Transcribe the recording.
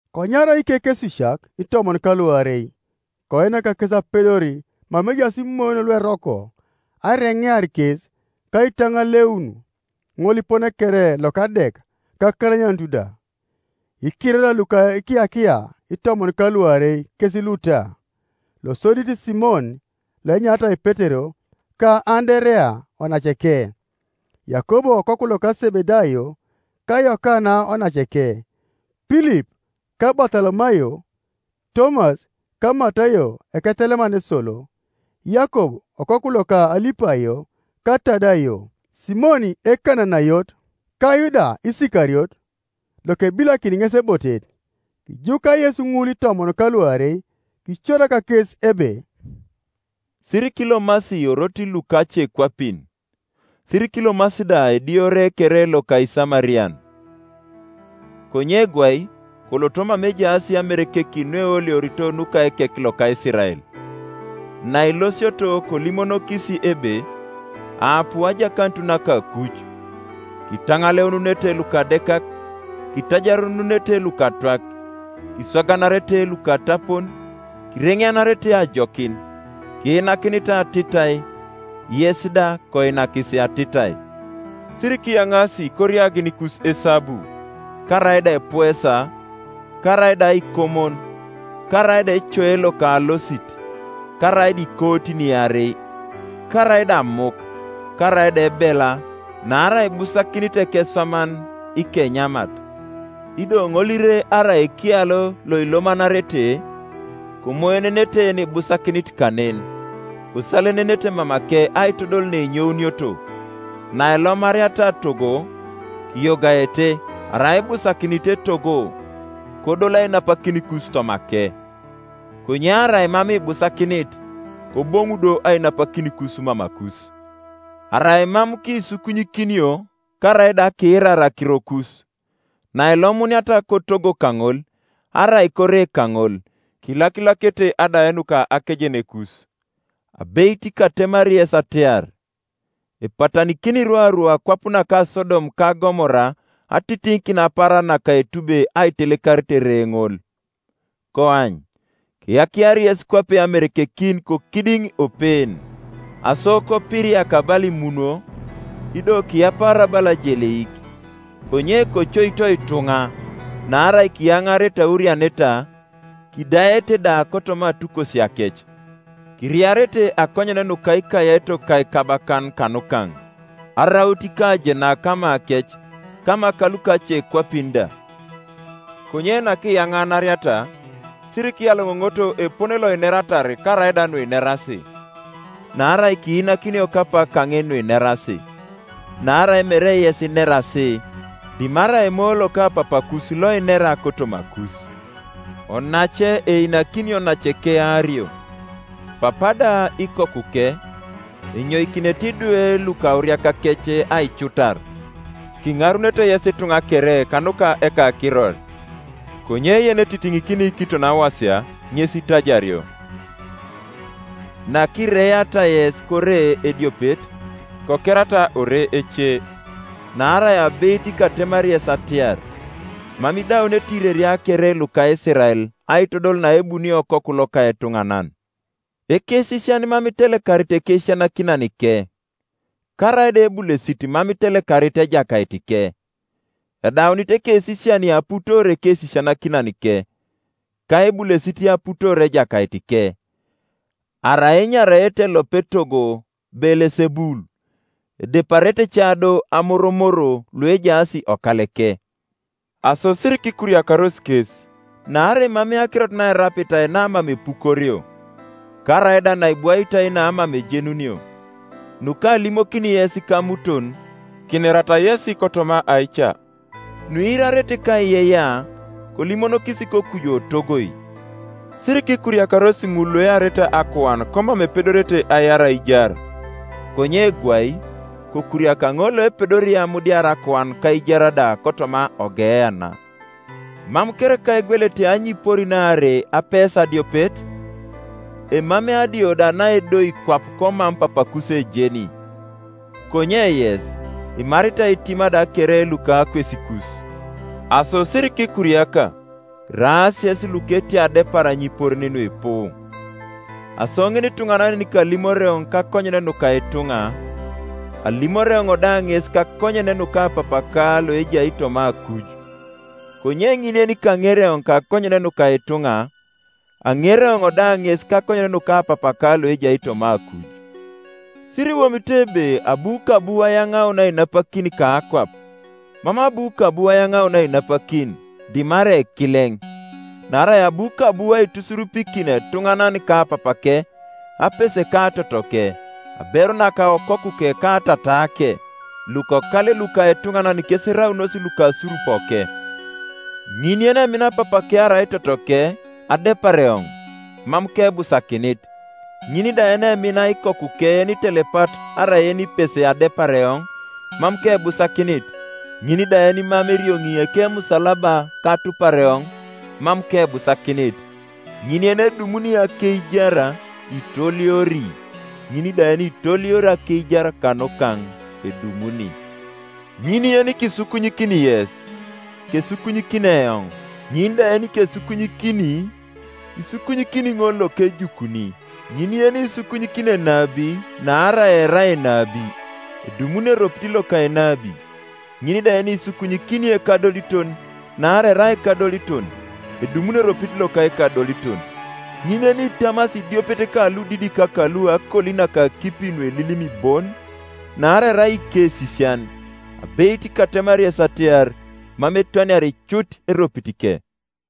Konyarau ikekesisiak itomon ka luarei, koinak kes apedor mama ejaas imoyon lueroko, aireŋear kes, ka aitaŋaleun ŋolipone kere loka adek ka akalanyanut da. Ikiroria luka ikiyakia itomon ka luarei kes luta: losodit, Simon, loenyaritai Petero, ka Anderea onaceke; Yakob okoku loka Sebedayo, ka Yokana onaceke; Pilip ka Batolomayo; Tomas ka Matayo eketeleman esolo; Yakob okoku loka Alipayo, ka Tadayo; Simon Ekananayot, ka Yuda Isikariot, lokebilakini ŋes ebotet. Kijuka Yesu ŋul itomon ka luarei, kicorak kes ebe, “Sirikilomasi orotin luka lukacekwapin, sirikilomasi da ediore kere loka Isamarian, konye gwai koloto mama ejaas amerekekin nueoliorito nuka ekek loka Isirael. Nailosioto kolimonokis ebe, ‘Aapu ajakanut naka akuj’. Kitaŋaleununete lukadekak, kitajarununete lukatwak, kiswaganarete lukatapon, kireŋeanarete ajokin, Kiinakinitai atitai, yes da koinakis atitai. Sirikiyaŋaasi koriaginikus esabu, karaida epuesa, karaida aikomon, karaida ecoe loka alosit, karaida ikootin iarei, karaida amuk, karaida ebela; naarai ibusakinit ekeswaman ikenyamat. Ido ŋolire arai ekialo loilomanarete, komoenenete yenibusakinit kanen, kosalenenete mamake aitodol neinyounioto. Nailomariata togo, kiyogaete. Arai ibusakinit etogo, kodol ainapakinikus tomake; konye arai mam ibusakinit, koboŋu do ainapakinikus mamakus. Arai mam kisukunyikinio karaida akiirar akirokus, nailomuniata kotogo kaŋol, arai kore kaŋol, kilakilakete adae nuka akejenekus. Abeit, katemari yes atiar, Epatanikini rwaru akwap naka Sodom ka Gomora atitiŋikin kapaaran naka etube aitelekarit ere ŋol. “Koany, keyakiari yes kwape amerekekin kokidiŋ opeen; aso kopiriaka bala imunwo, ido kiyapaara bala ajeleik. Konye kocoito ituŋa; naarai kiyaŋaarete aurianeta, kidaete da kotoma atukosiakec. Kiriarete akonyen nuka ikayaitok ka ikabakan kanukaŋ, araut ikajenak kamakec, kama kalukacekwapin da. Konye nakiyaŋanariata, sirikiyaloŋoŋoto epone loineratar karaida nuinerasi; naarai kiinakinio kapak kaŋin nuinerasi; naarai mere yes inerasi, dimarai Emoyo loka Papakus loinera kotomakus. Onace einakini onaceke aario, papa da ikokuke, enyoikinete idwe lukauriakakec aicutar; kiŋarunete yes ituŋa kere kanuka ekakiror. Konye yenetitiŋikini kiton awasia ŋes itajario. Nakireiata yes kore ediopet, kokerata ore ece, naarai abeit katemari yes atiar, Mam idaunete ireria kere luka Isirael aitodol naebunio Okoku loka etuŋanan. “Ekesisian mam itelekarit ekesisianakinanike, karaida ebulesit mam itelekarit ejakaitike. Edaunit ekesisian aputoor ekesisianakinanike, ka ebulesit aputoor ejakaitike. Arai enyaraete elopet etogo Beelesebul, edeparete ca do amoromor luejaas okaleke. “Aso sirikikuriakaros kes; naarai emamei akirot naerapitai namam epukorio, karaida naibwaitai namam ejenunio. Nukalimokini yes kamuton, kinerata yesi kotoma aica; nuiirarete kaiyeiyea, kolimonokis kokuju otogoi. Sirikikuriakaros ŋul luearete akuan komam epedorete aiar aijar; konye gwai kokuriaka ŋol loepedori amudiar akuan ka aijar da kotoma oGeena. Mam kereka egwelete anyiporin aarei apesa adiopet? Emamei adio da naedoi kwap komam Papakus ejeni, Konye yes, imaritai itima da kere luka akwesikus. Aso sirikikuriaka; iraas yesi luka etiai adepar anyiporin nuipu. Aso ŋinituŋanan yenikalimori eoŋ kakonyen nuka ituŋa, alimori eoŋ da ŋes kakonyen nuka Papaka loejai toma akuj; konye ŋin yenikaŋeri eoŋ kakonyen nuka ituŋa, aŋeri eoŋ da ŋes kakonyen nuka Papaka loejai toma akuj. “Siriwomito ebe abu kabu ayaŋaun ainapakin kakwap: mam abu kabu ayaŋaun ainapakin, dimarai ekileŋ. Naarai abu kabu aitusurupikin etuŋanan ka papake, apese ka totoke, aberu naka okokuke ka tataake. Lukokale luka etuŋanan kes eraunos lukasurupoke. Ŋin yenemina papake arai totoke adepar eoŋ, mam kebusakinit; ŋin da yenemina ikokuke yenitelepat arai yenipese adepar eoŋ, mam kebusakinit. Ŋin da yenimam erioŋi ekemusalaba ka atupar eoŋ, mam kebusakinit. Ŋin yenedumuni akeijar itooliori, ŋin da yenitooliori akeijar kanukaŋ edumuni. “Ŋin yenikisukunyikini yes, kesukunyikini eoŋ, ŋin da yenikesukunyikini, isukunyikini ŋol lokejukuni. Ŋin yenisukunyikini enabi naarai erai enabi, edumuni eropit loka enabi, ŋin da yenisukunyikini ekadoliton naarai erai ekadoliton, edumuni eropit loka ekadoliton. Ŋin yenitamasi idiopet ka ludidik kalu akoli naka akipi nuelilim bon, naarai erai ikesisian, abeit katemari yes atiar, mam etwaniari cut eropitike.”